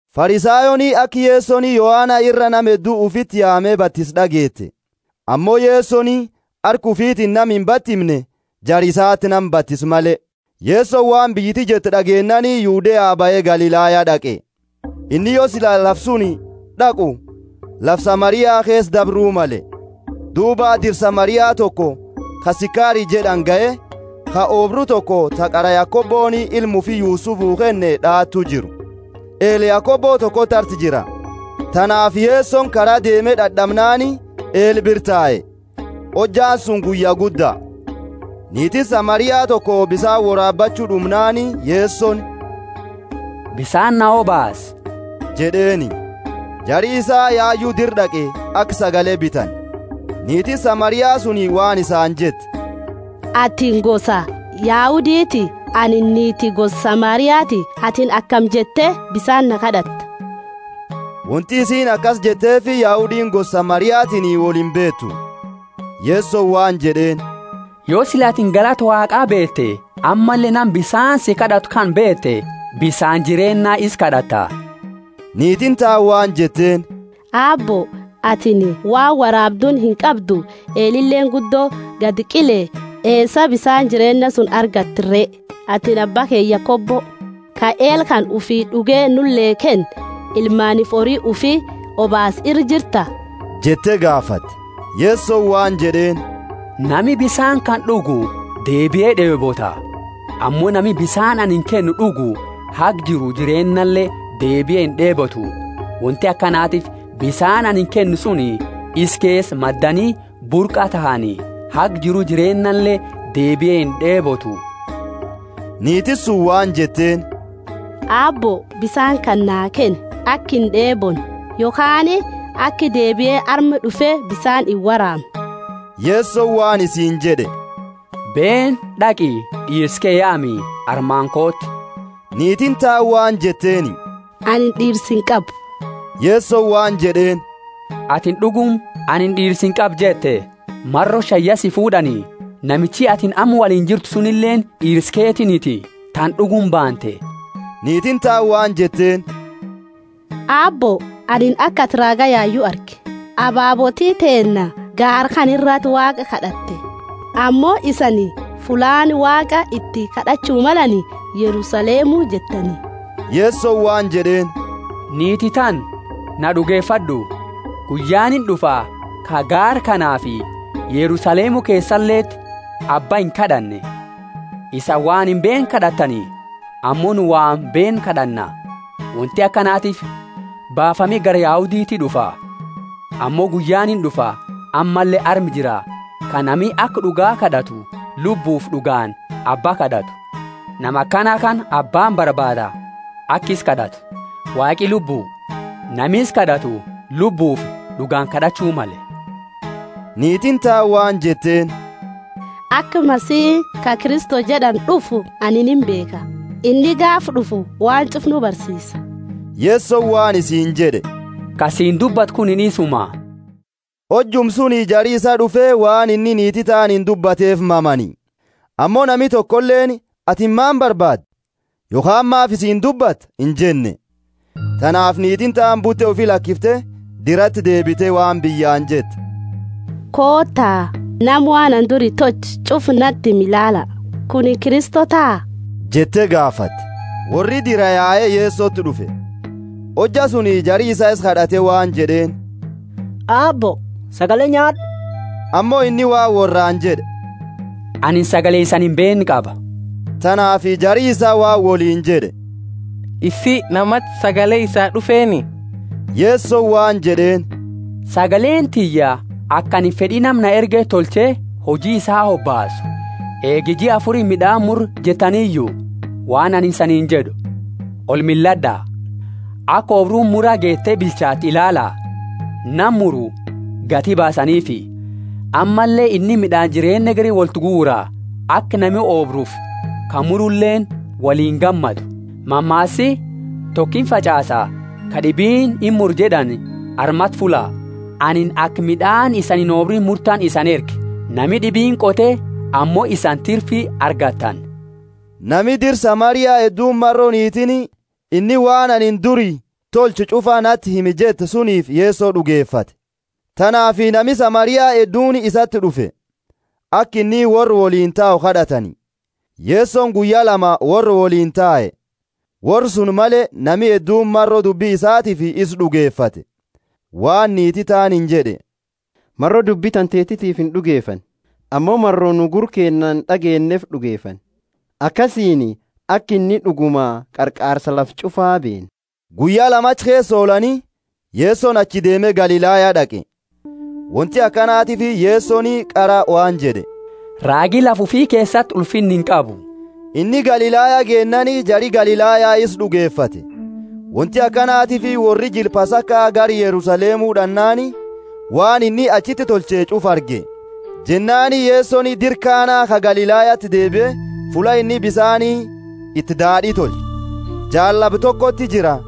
Farisayooni aka Yesoni Yohana ira nama heddu ufiti yaame batise d'ageete. (Ammo Yesoni harka ufiitini nama imbatimne, jara isati nama batise male.) Yesoni waan biyyiti jettu d'ageennaani Yudea bahe Galilaya d'aqe. Inni yo sila lafa suni d'aqu, lafa Samaria keesa dabru male. Duuba dira Samaria toko, ka Sikari jed'ani gahe, ka oobru toko ta qara Yakoboni ilma ufi Yusufuu kenne d'aatu jiru. Eela Yakobo tokoti arti jira. Tanaafi Yesoni kara deeme dad'amnaani, eela bira tae. Hojjaani suni guyya gudda. Niitiini Samaria toko bisaani woraabachu d'umnaani Yesoni, Bisaani na obaasi jed'eeni. (Jari isaa yayu dira d'aqe, aka sagale bitani.) Niitiini Samaria suni waan isaani jette, Atini gosa Yahuditi; anini niiti gosa Samariati; atini akami jette bisaani na kad'atta? (Wonti isiini akasi jetteefi Yahudiini gosa Samariatiini wolimbeetu.) Yesoni waan jed'eeni, Yo sila atini galata Waaqaa beete ammalle nama bisaani si kad'atu kana beete, bisaani jireenna isa kad'atta. Niitiini taani waan jetteeni, Aabbo, atini waan woraabduuni inqabdu, eelileeni guddo gadi qile, eesa bisaani jireenna suni argatta re? Atini abba keenna Yakobo, ka eela kana ufi d'uge nule kenne, ilmaaniifi hori ufi obaase ira jirta? jette gaafate. Yesoni waan jed'eeni, Nami bisaani kana d'ugu deebie d'eebota, ammo nami bisaani anini kennu d'ugu haga jiru jireennale deebie ind'eebotu. Wonti akanatiifi bisaani anini kennu suni isa keesa maddani burqa tahani, haga jiru jireennale deebie ind'eebotu. Niitiini suni waan jetteeni, Aabbo, bisaani kana naa kenni, aka ind'eebonne, yokhaani aka deebie arma d'ufe bisaani iworaamne. Yesoni waan isiini jed'e, Beeni, d'aqi, d'iirsa ke yaami, armaani kooti. Niitiini taani waan jetteeni, Anini d'iirsa inqabu. Yesoni waan jed'eeni, Atini d'uguma, Anini d'iirsa inqabu jette. Maro shani ya si fuud'ani, namichi atini amma woliini jirtu sunileeni d'iirsa keetiiniti, tana d'uguma baante. Niitiini taani waan jetteeni, Aabbo, anini aka atini raaga yayu arge. Ababooti teenna gaara kana irati Waaqa kad'atte, ammo isani, Fullaani Waaqa iti kad'achu malani Yerusalemu jettani. Yesoni waan jed'eeni, niiti tana, na d'ugefad'u, guyyaani ind'ufa ka gaara kanaafi Yerusalemu keesaleti! Abba inkad'anne. Isani waan imbeenne kad'attani, ammo nu waan beennu kad'anna; wonti akanatiifi baafami gara Yahuditi d'ufa. Ammo guyyaani ind'ufa, ammalle arma jira, ka nami aka d'uga kad'atu lubbufi d'ugaani Abba kad'atu. Nama akana kana Abbaani barbaada aka isa kad'atu. Waaqi Lubbu, nami isa kad'atu lubbufi d'ugaani kad'achu male. Niitiini taani waan jetteeni, Aka Masihi, ka Kristo jed'ani d'ufu, anini imbeekha. Inni gaafa d'ufu waan ch'ufa nu barsiisa. Yesoni waan isiini jed'e, Ka siini dubbatu kunini isuma. Hojuma suni jari isaa d'ufe, waan inni niiti taaniini dubbateefi mamani. Ammo nami tokoleeni, Atini maani barbaada? yokhaani, Maafi isiini dubbatta? injenne. Tanaafi niitiini taani bute ufi lakifte, dirati deebite waan biyyaani jette, Koota, nama waan anini duri tolche ch'ufa nati hime ilaala. Kunini Kristo taha? jette gaafate. Worri diraa yae Yesoti d'ufe. Hojja suni jari isaa isa kad'ate waan jed'eeni, Aabbo, sagale nyaad'u. Ammo inni waan worraani jed'e, Anini sagale isani imbeenne qaba. Tanaafi jari isaa waan woliini jed'e, Isii, namati sagale isaa d'ufeeni? Yesoni waan jed'eeni, Sagaleeni tiyya aka anini fed'i nama na erge tolche huji isaa hobaasu. Eegi jia afuri mid'aani murra jettaniyu? Waan anini isaniini jed'u, Olmillad'a, aka oobruuni mura geete bilchatte ilaala. Nama muru gati baasaniifi, ammalle inni mid'aani jireenna hegeri woltiguura; aka nami oobrufi ka muruleeni woliini gammadu. Mammaasi, Toko imfach'aasa, kad'ibiini imura jed'ani armati fulla. Anini aka mid'aani isani inobriini murtani isani erge; nama d'ibiini qote ammo isani tirfi argattani. Nami dira Samaria hedduuni maro niitiini, Inni waan anini duri tolche ch'ufa nati hime jette suniifi Yeso d'ugefate. Tanaafi nami Samaria hedduuni isati d'ufe, aka inni worra woliini tau kad'atani; Yesoni guyya lama worra woliini tae. Worra suni male, nami hedduuni, maro dubbi isaatiifi isa d'ugefate, waan niiti taaniini jed'e, Maro dubbi tantetiifi ind'ugefanne, ammo maro nu gurra keennaani d'ageenneefi d'ugefanna, akasiini aka inni d'uguma Qarqaarsa lafa ch'ufa beena. Guyya lama achi keesa ollaani, Yesoni achii deeme Galilaya d'aqe. Wonti akanatiifi Yesoni qara waan jed'e, Raagi lafa ufi keesati ulfinna inqabu. Inni Galilaya geennaani jari Galilaya isa d'ugefate; wonti akanatiifi worri jila Pasaka gara Yerusalemu d'annaani, waan inni achiti tolche ch'ufa arge. Jennaani Yesoni dira Kana ka Galilayati deebie, fulla inni bisaani iti daad'i tolche. Jaallaba tokoti jira,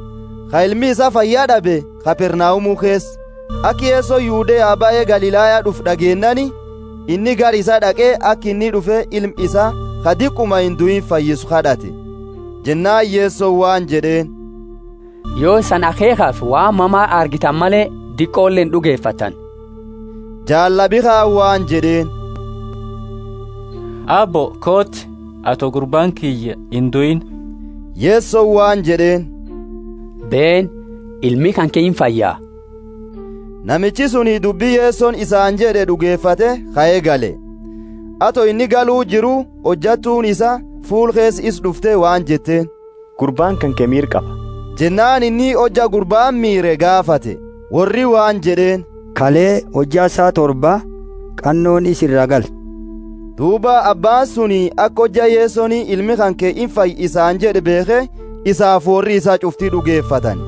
ka ilmi isaa fayya d'abe, Kapernaumu keesa. Aka Yesoni Yudeaa bahe Galilaya d'ufe d'ageennaani, inni gara isaa d'aqe aka inni d'ufe ilma isaa ka diquma induiini fayyisu kad'ate. Jennaani Yesoni waan jed'eeni, Yo isani akheekhafi waan mama argitani male, diqole ind'ugefattani. Jaallabi kaani waan jed'eeni, Aabbo, kooti, ato gurbaani kiyya induiini. Yesoni waan jed'eeni, Beeni, ilmi kanke imfaya! Namichi suni dubbi Yesoni isaani jed'e d'ugefate, kae gale. Ato inni galu jiru, hojattuuni isaa fuula keesa isa d'ufte waan jetteeni, Gurbaani kanke miira qaba. Jennaani inni hojja gurbaani miire gaafate. Worri waan jed'eeni, Kale, hojja saa torba, qannooni isa iraa galte. Duuba abbaani suni aka hojja Yesoni, Ilmi kanke imfaya isaani jed'e beekhe, isaafi worri isaa ch'ufti d'ugefatani.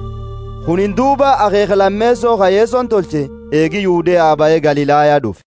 Kunini duuba akheekha lameeso ka Yesoni tolche, eegi Yudea bahe Galilaya d'ufe.